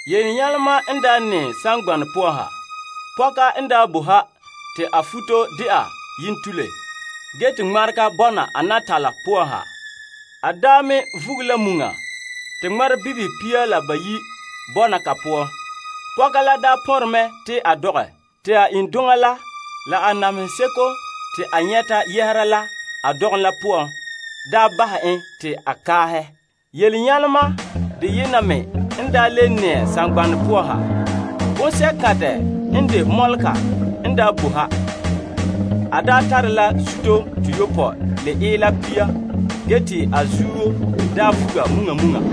Yelenyalema n nɛɛ saŋgbanɛ poan ha. Pɔka n daa bo ha te a futo dɛna yentule, te ŋmarega bɔna a natala poan ha. A me vuge la muŋa te ŋmarebibihe pia la bayi' bɔna ko poan. Pɔka la pɔnre mɛ te a dɔgɛ. Te a iŋduŋa la la namehe seko te a nyɛta yɛhera la a dɔgom la poan bahɛ te a kaaha mɛ. Yelenyalema deyena me n le nɛɛ saŋgbanɛ poan ha. Bonsɛ'kantɛ n de mɔlega n boe ha. A tare la zuto toyopɔe la ila pia te a zuto la daa vuga muŋa muŋa.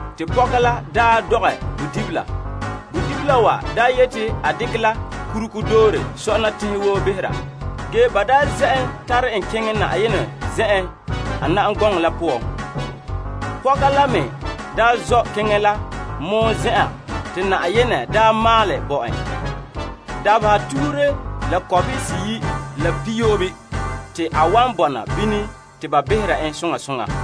Te pɔka la dɔgɛ bodibila. Bodibila wa yeti a dekɛ la kurugo doore sɔna teŋhe woo behera. Ge ba zɛ' en tare en keŋɛ Yenɛ zen'en la a na'am gɔŋɔ la poan. Pɔka la me zɔ' keŋɛ la mɔɔ zen'an te Yenɛ daa maalɛ bo en. Dabeha tuhure la kɔbehe seyi' la pihiyoobe te a wan bɔna bini te ba behera en soŋa soŋa.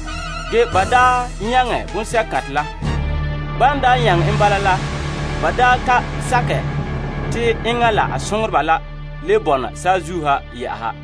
Ge ba nyaŋɛ bonsɛ'kantɛ la. Ban nyaŋɛ en bala la, ba ka sakɛ te enŋa la a soŋoreba la le bɔna saazuo ha.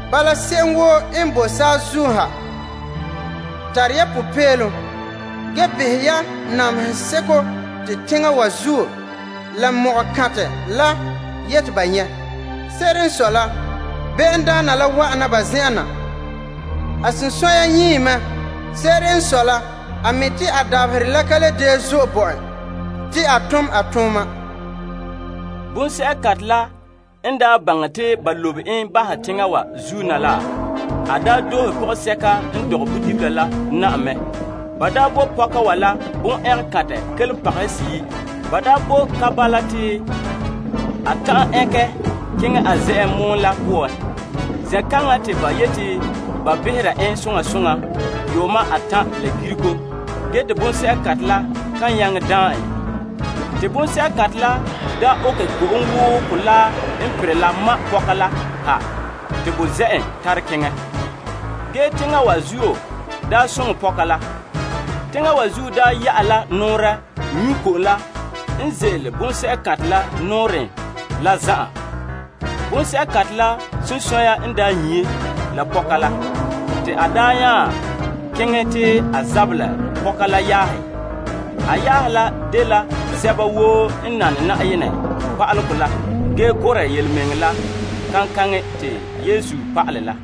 Bala, se'em woo n boe saazuo ha, tara ya popeelom. Ge behɛ ya namehe seko te teŋa wa zuo la ko'kantɛ la yeti ba nyɛ'. Se'ere n sɔe la sagona la wa'an ya zen'en na. A sunsunya nyii mɛ. Se'ere n sɔe la, a mi' te a dabaherɛ la ka le gee zo'e te a tom a tooma. Te bonsɛ'kantɛ la n daa baŋɛ te ba lobe en bahɛ la teŋa wa zuo na la, a doohe pɔgɔsɛka n dɔgɛ bodibila la na'ma. Ba bo pɔka wa la tuguho kelompagehe seyi'. Ba bo ka bala te a ta'an ɛnkɛ keŋɛ a zen'en mɔen. Zen'kaŋa te ba yeti ba behera en saŋa, saŋhe, la saŋa gito te bonsɛ'kantɛ la kan ta'an daan en. Te bonsɛ'kantɛ la okɛ ko'om woo kolaa n perɛ la ma' pɔka la ha te bo zɛ' en tare keŋɛ. Ge teŋa wa zuo soŋɛ pɔka la. Teŋa wa zuo ya'ɛ la nɔɔrɛ nyu' ko'om la n ze'ele bonsɛ'kantɛ la nɔɔrɛn la zan'an. Bonsɛ'kantɛ la sunsunya n nyii pɔka la. Te a nya keŋɛ te a zabɛ la pɔka wa yaahe woo. A yaahe la dela sɛba woo n de birikindoma bo Yenɛ pa'alegɔ la ge gurɛ yelemɛŋɛrɛ la kaŋkaŋɛ te Yesu pa'alɛ la.